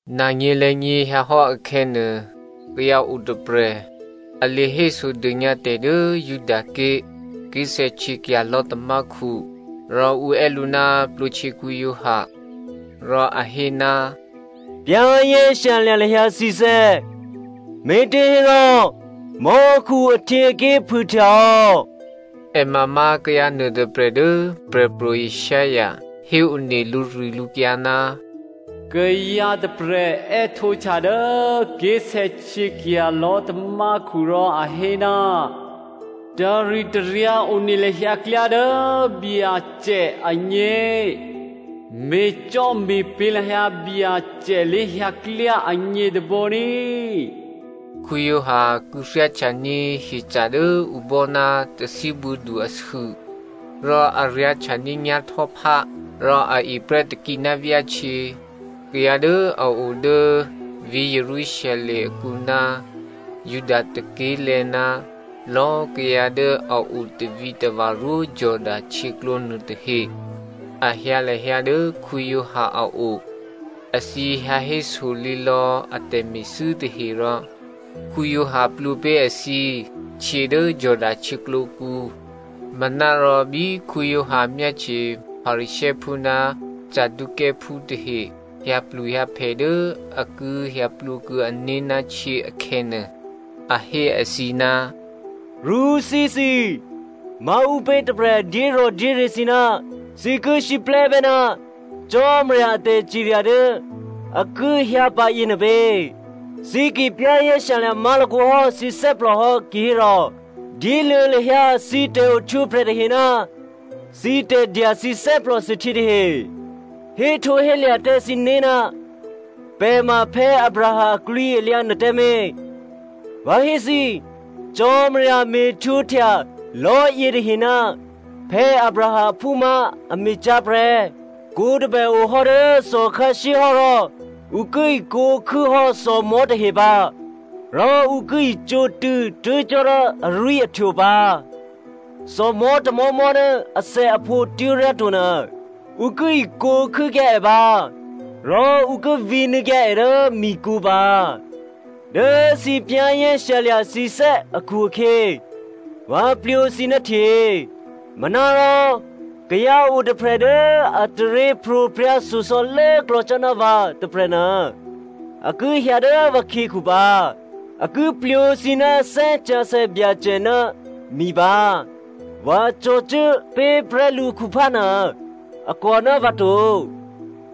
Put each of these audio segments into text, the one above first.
Nanyě̤lè̌nyě̤ hyǎhò́ akhè̌nuô, kayǎ otôprè̤, a lě hésodônyǎ tè̤ dố Judaké̤ ké̤sè̌htyěkya̤ lò̤́tamákhu, rò ǔ è́ lǔ ná Giovanni Baptista. Rò a hé, “Za̤ ní̤dû lahyǎ thǐné̤, me̤těhérò mò́khu ahtyěaké̤ phûhtyahò́.” È ma má̤ kayǎ nuôtôprè̤ dố Prè̤pro̤ Isaiah héone lǔrilǔkyǎ, “Kayǎ tôprè̤ è́htǒhtya dố ké̤sè̌htyěkya̤ lò̤́tamákhu rò a hé, ‘Taritaryǎ one lahyǎ klyá dố Byacè agně. Me̤cò́me̤pě̤ lahyǎ Byacè lé̤hyǎklyá agně tôbǒ ní꤮.’” Giovanni kû̌thyáhtyaní̤ hyeca̤ dố ǔ bò́ ná tathíbuô̌du asû, rò a ryá̤htyaní̤ nyá̤htò́phá. Rò a eprè́ takǐ ná vyáhtyě. Kayǎ dố a odố vǐ̤ Jerusalem akǔ ná Juda tôké̤lè̤̌ ná lò̌꤮ kayǎ dố a o tavǐtava̤ rwó Jordano htyěklǒ nuôtahe a hyǎ lahyǎ dố Giovanni a o. Èthǐ hyǎ héso lǐlò̌ a tè̤me̤thû́ tahe rò Giovanni plwǒ pé̤ èthǐ htyě dố Jordano htyěklǒkǔ. Manárò bí Giovanni myáhtye Pharisěophú ná Saducěophú tahe hyǎpluhyǎphè dố a ki hyǎplwǒ kuô̌ ané̤ ná htyě akhè̌nuô, a hé èthǐ, “Rṳ́thíthǐ꤮! Maǔpě tôprè̤ dyérò̤dyéryě̤ thǐ ná thǐ ki siplè́bè́ ná Cò́marya a tè̤cirya dố a ki hyǎpǎ yěnuô pě? Thǐ ki za̤ ní̤dû má̤lakǒ hò́ thǐné̤ hò́ kihérò dyéluô̌ lahyǎ thǐ tè̤ohtwǒprè̤ tahe ná thǐ tè̤dya thǐ thè́plòthuôhtyě tahe. Héhtǒhélya̤ tǎ thǐné̤, ‘Pè̤ ma Abraham aklwǐalyǎ’ nuôtǎmé̤. Vǎ hé thǐ, Cò́marya me̤htwǒhtya lò̤́yětahe ná Abraham aphú má̤ a me̤cyá̤ prè́. Kwǒ tôbè ohò́ dố thòkhǎshyéhò́ rò ǔ ki ikwǒ̤ khû́hò́ thòmò̤́ tahe pǎ, rò ǔ ki icǒtṳ̂̌ tuố̤ cò́ dố arwí̤ahtwo pǎ. Thòmò̤́ tômò̤́mò̤́ dố athèaphǒ twó̤ryá to nuô, ǔ ki ikwǒ̤ khû́kyǎ è pǎ rò ǔ ki vǐnuô̌kyǎ è dố mikǔ pǎ. “Dố thǐ za̤ ní̤ thǐné̤ akhu-akhyě vǎ plwǒ thǐ ná htyě. Manárò kayǎ otôprè̤ dố a taryěpro̤prya̤ shyosò̌ lốklò̌ cò́ ná vǎ tôprè̤nuô a ki hyǎ dố vǎkhyěkhu pǎ. A ki plwǒ thǐ ná Thè́ Sǎsè̌ Byacè ná mi pǎ. Vǎ cò̤̌cuố pé̤ prè́ lǔkhuphá nuô, a kòná vǎ to.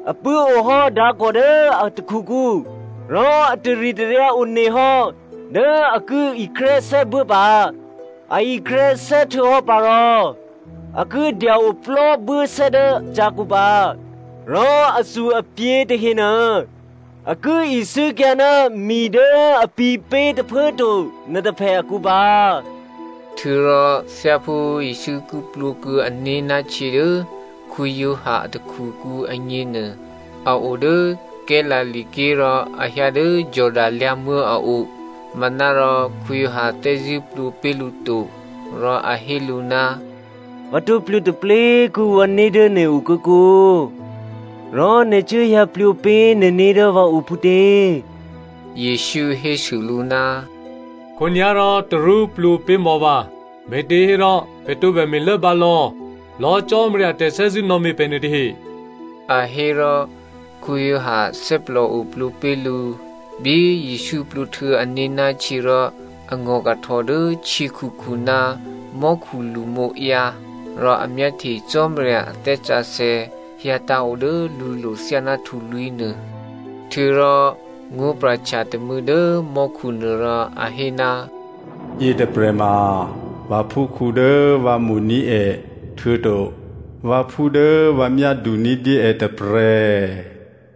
A pṳ̂́ohò́ dǎkò̤ dố a takhukǔ, rò a taritaryǎ onehò́ dố a ki ikrè́sè́ buố pǎ. A ikrè́sè́ htuô̌hò́ pǎ rò a ki dya-oplò́ buốsè́ dố cyǎkǔ pǎ. Rò athu-aphǐ tahenuô a ki isû́kyǎ ná mi dố a pǐ̤pé̤ tôphuố꤮ to nuôtôphè akǔ pǎ.” Htuô̌rò thyáphú Jesǔ ki plwǒ kuô̌ ané̤ ná htyě dố Giovanni a takhukǔ agně nuô a odố Galilea ké̤ rò a hyǎ dố Jordano lyǎ̤muố̤ a o. Manárò Giovanni thè́zṳ̂́ plwǒ pé̤ lǔ to. Rò a hé lǔ, “Vǎ tǒ plwǒ taplé꤮ kuô̌ vǎné̤ dố nè̤ o kǒkǒ rò nè̤ cuốhyǎ plwǒ pé̤ nè̤né̤ dố vǎo phútě?” Jesǔ hésû lǔ, “Khǒnyá̤ rò tarú plwǒ pé̤ mò̌ vǎ, me̤těhérò pè̤ tǒbè me̤lốbǎ lò̌lò̌꤮ Cò́marya a tè̤thè́zṳ̂́ nò̌me̤ pè̤ nuôtahe,” a hé rò Giovanni thè́plòo plwǒ pé̤ lǔ. Bí Jesǔ plwǒhtuô̌ ané̤ ná htyě rò a ngò̤kahtò dố htyěkhukhu ná mò́khu lṳmǒǎyǎ. Rò a myáhtye Cò́marya a Thè́ Sǎsè̌ hyǎtǎ̤ odố lǔlo̤ thyáná htulwí̤ nuô. Htuô̌rò ngó̤pra̤htya tômû̌ dố mò́khunuô rò a hé, “Yětôprè̤ ma vǎphúkhǔ dố vǎ mo̤ní̤ è htuô̌to vǎphú dố vǎ myádu ní̤dyé è tôprè̤.”